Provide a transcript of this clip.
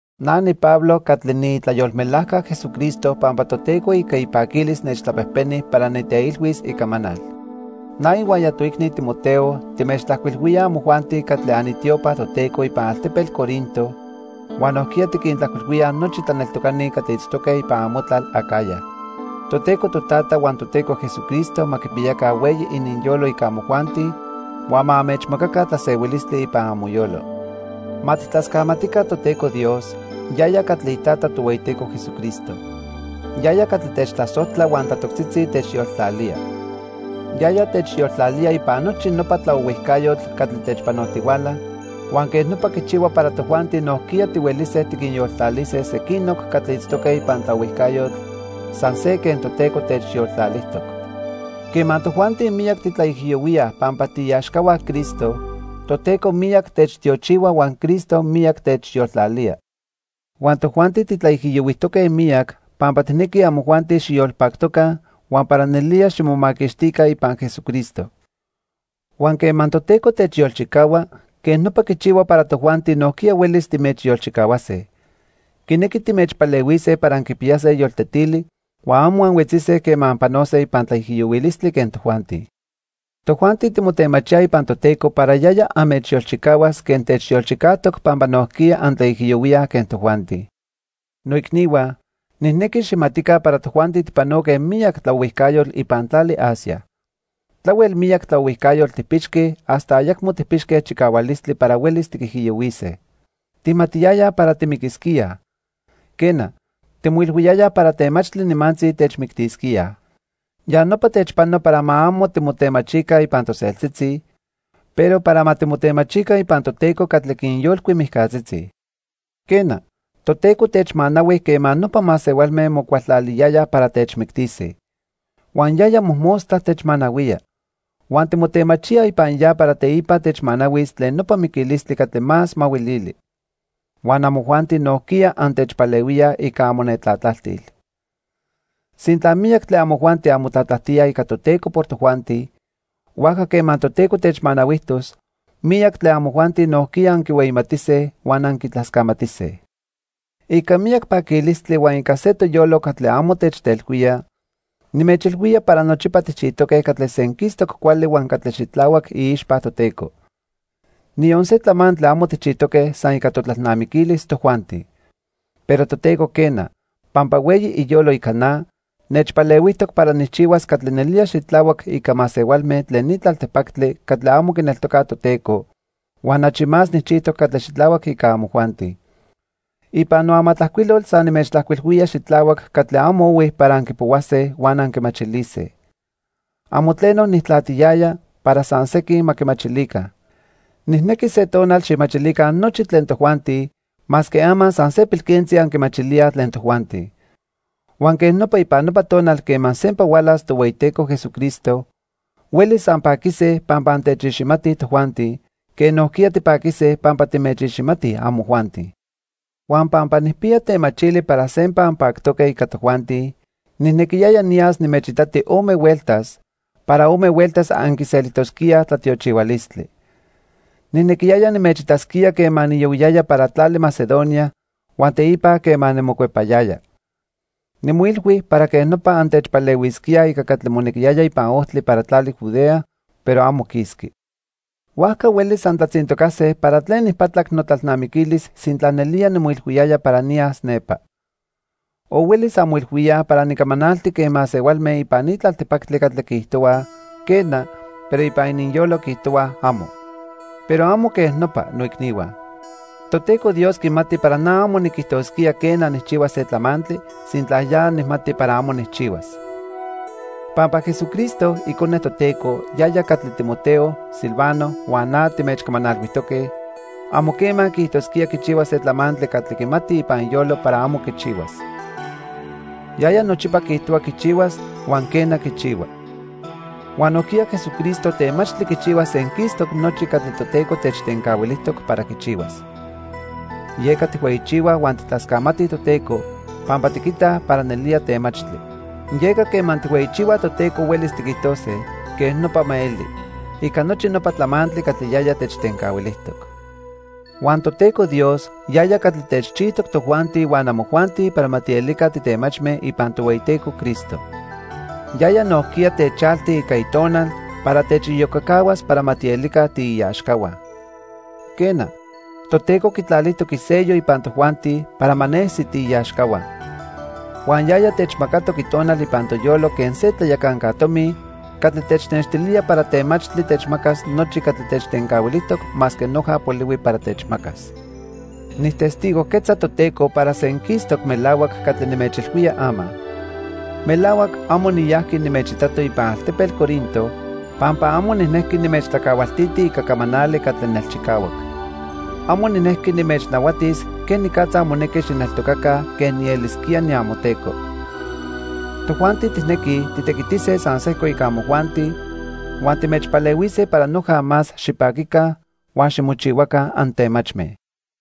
Na niPablo catli niitlayolmelajca Jesucristo pampa Toteco ica ipaquilis nechtlapejpeni para niteilhuis icamanal. Na ihuaya toicni Timoteo timechtlajcuilhuíaj amojuanti catli anitiopa Toteco ipan altepetl Corinto huan nojquiya tiquintlajcuilhuíaj nochi tlaneltocani catli itztoque ipan amotlal Acaya. Toteco Totata huan Toteco Jesucristo ma quipiyaca hueyi ininyolo ica amojuanti huan ma anmechmacaca tlasehuilistli ipan amoyolo. Ma tijtlascamatica Toteco Dios, yaya catli iTata Tohueyiteco Jesucristo. Yaya catli techtlasojtla huan tlatoctzitzi techyoltlalía. Yaya techyoltlalía ipan nochi nopa tlaohuijcayotl catli techpanotihuala huan quej nopa quichihua para tojuanti nojquiya tihuelise tiquinyoltlalise sequinoc catli itztoque ipan tlaohuijcayotl san se quen Toteco techyoltlalijtoc. Quema tojuanti miyac titlaijiyohuíaj pampa tiiaxcahua Cristo, Toteco miyac techtiochihua huan Cristo miyac techyoltlalía. Huan tojuanti titlaijiyohuijtoque miyac pampa tijnequij amojuanti xiyolpactoca huan para nelía ximomaquixtica ipan Jesucristo. Huan quema Toteco techyolchicahua, quej nopa quichihua para tojuanti nojquiya huelis timechyolchicahuase. Quinequi timechpalehuise para anquipiyase yoltetili huan amo anhuetzise quema anpanose ipan tlaijiyohuilistli quen tojuanti. Tojuanti timotemachíaj ipan Toteco para yaya anmechyolchicahuas quen techyolchicajtoc pampa nojquiya antlaijiyohuíaj quen tojuanti. Noicnihua, nijnequi xijmatica para tojuanti tijpanoque miyac tlaohuijcayotl ipan tlali Asia. Tlahuel miyac tlaohuijcayotl tijpixque hasta ayacmo tijpixque chicahualistli para huelis tiquijiyohuise. Tijmatiyayaj para timiquisquíaj. Quena, timoilhuiyayaj para temachtli nimantzi techmictisquíaj. Ya nopa techpano para ma amo timotemachica ipan toseltzitzi, pero para ma timotemachica ipan Toteco catli quinyolcui mijcatzitzi. Quena, Toteco techmanahui quema nopa masehualme mocualtlaliyayaj para techmictise. Huan yaya mojmostla techmanahuía. Huan timotemachíaj ipan ya para teipa techmanahuis tlen nopa miquilistli catli más mahuilili. Huan amojuanti nojquiya antechpalehuíaj ica amonetlatlajtil. Sintla miyac tlen amojuanti anmotlatlajtíaj ica Toteco por tojuanti, huajca quema Toteco techmanahuijtos, miyac tlen amojuanti nojquiya anquihueyimatise huan anquitlascamatise. Ica miyac paquilistli huan ica se toyolo catli amo techtelhuía, nimechilhuía para nochipa tijchijtoque catli senquistoc cuali huan catli xitlahuac iixpa Toteco. Niyon se tlamantli amo tijchijtoque san ica totlalnamiquilis tojuanti. Pero Toteco quena, pampa hueyi iyolo ica na, nechpalehuijtoc para nijchihuas catli nelía xitlahuac ica masehualme tlen ni tlaltipactli catli amo quineltocaj Toteco huan achi más nijchijtoc catli xitlahuac ica amojuanti. Ipan noamatlajcuilol san nimechtlajcuilhuía xitlahuac catli amo ohui para anquipohuase huan anquimachilise. Amo tleno nijtlatiyaya para san sequin ma quimachilica. Nijnequi se tonal xijmachilica nochi tlen tojuanti, masque ama san se pilquentzi anquimachilíaj tlen tojuanti. Huan quej nopa ipan nopa tonal quema sempa hualas Tohueyiteco Jesucristo, huelis anpaquise pampa antechiximatij tojuanti, quen nojquiya tipaquise pampa timechiximatij amojuanti. Huan pampa nijpiya temachili para sempa anpactoque ica tojuanti, nijnequiyaya niyas nimechitati ome hueltas, para ome hueltas anquiselijtosquíaj tlatiochihualistli. Nijnequiyaya nimechitasquía quema niyohuiyaya para tlali Macedonia huan teipa quema nimocuepayaya. Nimoilhui para quej nopa antechpalehuisquíaj ica catli monequiyaya ipan ojtli para tlali Judea, pero amo quisqui. Huajca huelis antlatzintocase para tlen nijpatlac notlalnamiquilis sintla nelía nimoilhuiyaya para niyas nepa. O huelis anmoilhuíaj para nicamanalti quen masehualme ipan ni tlaltipactli catli quiijtohuaj, "quena", pero ipan ininyolo quiijtohuaj, "amo". Pero amo quej nopa, noicnihua. Toteco Dios quimati para na amo niquijtosquía, quena, nijchihuas se tlamantli, sintla ya nijmati para amo nijchihuas. Pampa Jesucristo, Icone Toteco, yaya catli Timoteo, Silvano huan na timechcamanalhuijtoque, amo quema quiijtosquía quichihuas se tlamantli catli quimati ipan iyolo para amo quichihuas. Yaya nochipa quiijtohua quichihuas huan, quena, quichihua. Huan nojquiya Jesucristo temachtli quichihuas senquistoc nochi catli Toteco techtencahuilijtoc para quichihuas. Yeca tijhueyichihuaj huan tijtlascamatij Toteco pampa tiquitaj para nelía temachtli. Yeca quema tijhueyichihuaj Toteco huelis tiquijtose: "Quej nopa ma eli" ica nochi nopa tlamantli catli yaya techtencahuilijtoc. Huan Toteco Dios yaya catli techchijtoc tojuanti huan amojuanti para ma tielica titemachme ipan Tohueyiteco Cristo. Yaya nojquiya techalti ica Itonal para techiyocacahuas para ma tielica tiiaxcahua. Quena, Toteco quitlalijtoc isello ipan tojuanti para ma nesi tiiaxcahua. Huan yaya techmacatoc Itonal ipan toyolo quen se tlayacanca tomi catli technextilía para temachtli techmacas nochi catli techtencahuilijtoc masque noja polihui para techmacas. Nijtestigojquetza Toteco para senquistoc melahuac catli nimechilhuía ama. Melahuac amo niyajqui nimechitato ipan altepetl Corinto pampa amo nijnejqui nimechtlacahualtiti ica camanali catli nelchicahuac. Amo nijnequi nimechnahuatis quenicatza monequi xijneltocaca quen nielisquía niamoteco. Tojuanti tijnequij titequitise san sejco ica amojuanti huan timechpalehuise para noja más xipaquica huan ximochihuaca antemachme.